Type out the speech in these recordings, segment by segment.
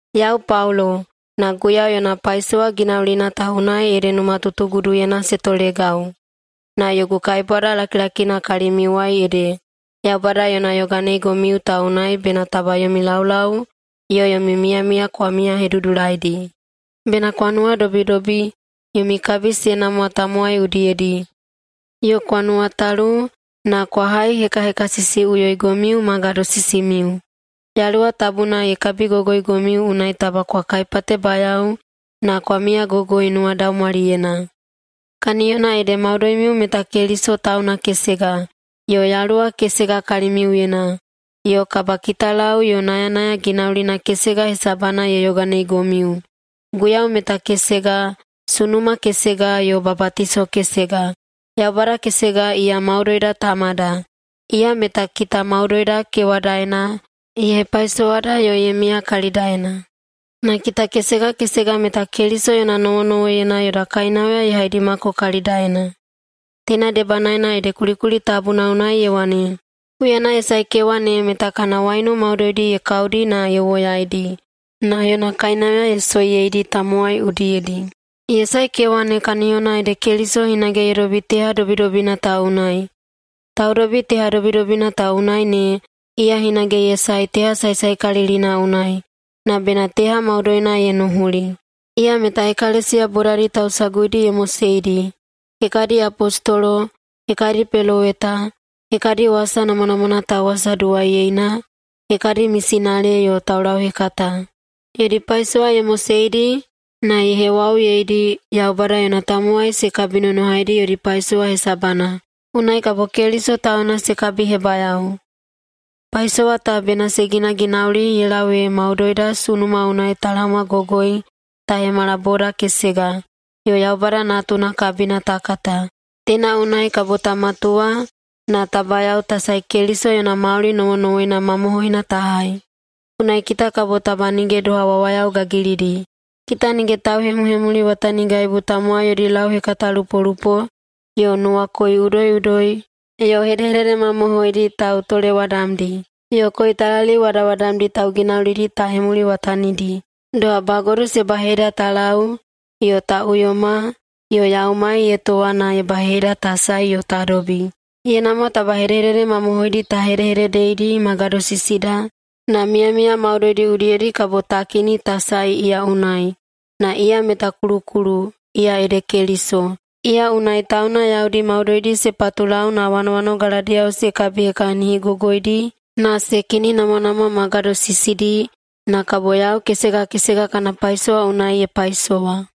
Yau Paulo, na Guiyau yona paisowa ginaulina ta unai ede numatutuguduyena se tolegau, na yogu kaibwada lakilakina kalimiuwai ede, Yaubada yona yoganeigomiu ta unai bena taba yomi laulau yo yomi miyamiya kwa miyahedudulaidi. Bena kwa nuwadobidobi, yomi kabi se namwa tamowai udiyedi, yo kwa nuwatalu, na kwa haihekahekasisiꞌuyoigomiu ma gadosisimiu. Yaluwa Tabuna ye kabigogoigomiu, unai taba kwa kaipatebayao na kwa miyagogoi nuwadaumwaliyena. Kaniyona ede maudoimiu meta Keliso tauna kesega, yo Yaluwa kesega kalimiuyena, yo kabakitalau yo nayanaya ginaulina kesega hesabana ye yoganeigomiu, Guiyau meta kesega, sunuma kesega yo babatiso kesega, Yaubada kesega iya maudoida Tamada, iya meta kita maudoida kewadaena, ye hepaisowada yo ye miya kalidaena. Na kita kesega kesega meta Keliso yona nowonowoiyena yoda kainauya ye haidimako kalidaena. Teina debanaena ede kulikuli tabuna unai ye wane, “Huyana ye sae kewa ne meta kana waiunu maudoidi ye kaudi na ye woyaidi na yona kainauya ye soiyeidi tamowai udiyedi.” Ye sae kewa ne kaniyona ede Keliso hinage ye dobi teha dobidobina ta unai. Taudobi teha dobidobina ta unai ne, iya hinage ye sae teha saesaekalilina unai, na bena teha maudoina ye nuhuli. Iya meta [ekalesiya bodadi tausaguidi] ye moseidi, hekadi apostolo, hekadi peloweta, hekadi wasa namwanamwana tauwasaduwaiyeina, hekadi mesinale yo taulauhekata. Yodi paisowa ye moseidi na ye hewauyeidi Yaubada yona tamowai se kabinonohaidi yodi paisowa hesabana, unai kabo Keliso tauna se kabihebayao. Paisowa ta bena se ginaginauli ye lau ee maudoida sunuma unai ta laomagogoi ta hemala boda kesega, yo Yaubada Natuna kabina ta kata. Teina unai kabo ta matuwa na ta bayao ta sae Keliso yona mauli nowonowoina mamohoina ta hai. Unai kita kabo taba nige doha wawayao gagilidi, kita nige tauhemuhemuliwatanigaibu tamowai yodi lauhekatalupolupo yo nuwakoi udoiꞌudoi yo hedehedede mamohoidi tautolewadamdi, yo koitalaliu wadawadamdi tauginaulidi ta hemuliwatanidi, doha bagodu se baheida ta lau yo ta uyoma yo yaumai ye towa na ye baheida ta sae yo ta dobi. Ye namwa taba hedehedede mamohoidi ta hedehededeidi ma gadosisida, na miyamiya maudoidi udiyedi kabo ta kini ta sae iya unai, na iya meta kulukulu, iya ede Keliso. Iya unai tauna yaudi maudoidi se patulau na wanowanogaladiyao se kabihekahinigogoidi na se kininamwanamwa ma gadosisidi na kabo yau kesega kesega kana paisowa unai ye paisowa.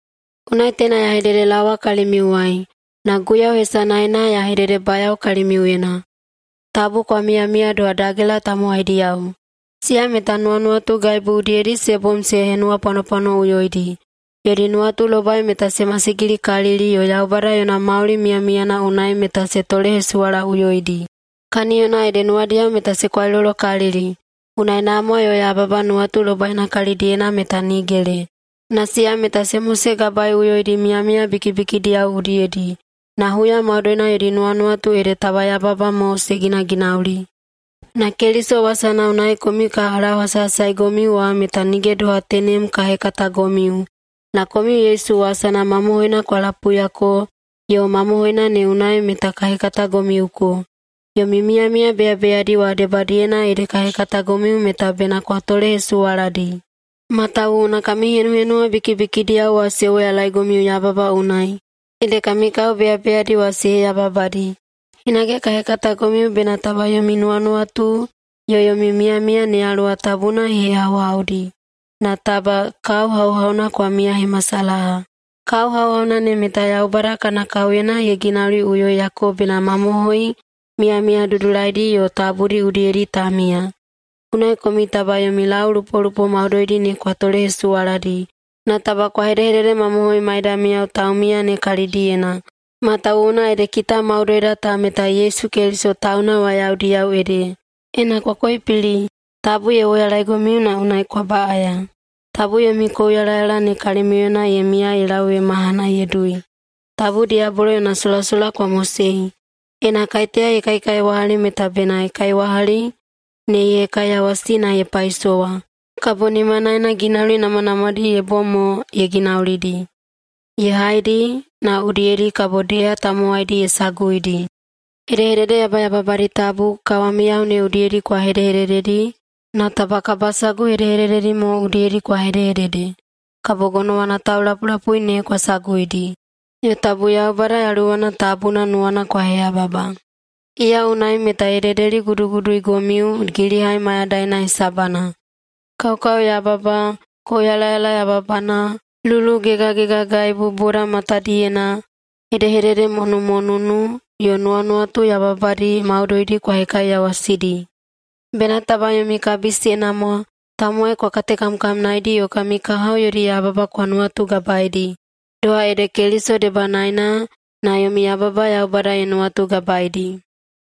Unai teina ya hededelaowa kalimiuwai, na Guiyau hesanaena ya hededebayao kalimiuyena, tabu kwa miyamiya doha dagela tamowaidiyao. Siya meta nuwanuwatugaibu udiyedi se bom se henuwapwanopwanoꞌuyoidi. Yodi nuwatulobai meta se masigilikalili yo Yaubada yona mauli miyamiyana unai meta se tolehesuwalaꞌuyoidi, kaniyona ede nuwadiyao meta se kwailolokalili. Unai namwa yo yababa nuwatulobaina kalidiyena meta nigele, na siya meta se mosegabaeꞌuyoidi miyamiya bikibikidiyao udiyedi. Na huya maudoina yodi nuwanuwatu ede taba yababa mo se ginaginauli. Na Keliso wasana unai komiu ka lauhasahasaigomiu wa meta nige doha tenem ka hekatagomiu. Na komiu Yesu wasana mamohoina kwa lapuiyako yo mamohoina ne unai meta ka hekatagomiuko. Yomi miyamiya beyabeyadi wa debadiyena ede ka hekatagomiu meta bena kwa tolehesuwaladi. Matawuwuna kami henuhenuwa bikibikidiyao wa se woyalaegomiu yababa unai, ede kami kao beyabeyadi wa se heyababadi. Hinage ka hekatagomiu bena taba yomi nuwanuwatu yo yomi miyamiya ne Yaluwa Tabuna ye hehauhaudi, na taba kao hauhauna kwa miyahemasalaha. Kao hauhauna ne meta Yaubada kana kaoyena ye ginauliꞌuyoiyako bena mamohoi miyamiya dudulaidi yo tabudi udiyedi ta miya. Unai komiu taba yomi laulaulupolupo maudoidi ne kwa tolehesuwaladi, na taba kwa hedehededemamohoi maidamiyao taumiya ne kalidiyena, matawuwuna ede kita maudoida ta meta Yesu Keliso tauna wa yaudiyao ede. Ena kwa koipili, tabu ye woyalaigomiu na unai kwa baꞌaya. Tabu yomi kouyalayala ne kalimiuyena ye miya ye lau ee mahana ye dui. Tabu diyabolo yona solasola kwa mosei. Ena kaiteya ye kaikaiwahali meta bena kaiwahali ne ye hekaiyawasi na ye paisowa, kabo nimanaena ginauli namwanamwadi ye bom ye ginaulidi, ye haidi, na udiyedi kabo deha tamowaidi ye saguidi. Hedehedede yabayababadi tabu kawamiyao ne udiyedi kwa hedehedededi na taba kabasagu hedehedededi mo udiyedi kwa hedehedede, kabo gonowana taulapulapui ne kwa saguidi. Yo tabu Yaubada Yaluwana Tabuna nuwana kwa heyababa. Iya unai meta ye dedeliguduguduigomiu gilihai mayadaina hesabana. Kaokaoyababa, kouyalayala yababana, lulugegagegagaibu boda matadiyena, hedehededemonumonunu yo nuwanuwatu yababadi maudoidi kwa hekaiyawasidi. Bena taba yomi kabi se namwa, tamowai kwa katekamkamnaedi yo kami kahao yodi yababa kwa nuwatugabaedi, doha ede Keliso debanaena na yomi yababa Yaubada ye nuwatugabaeidi.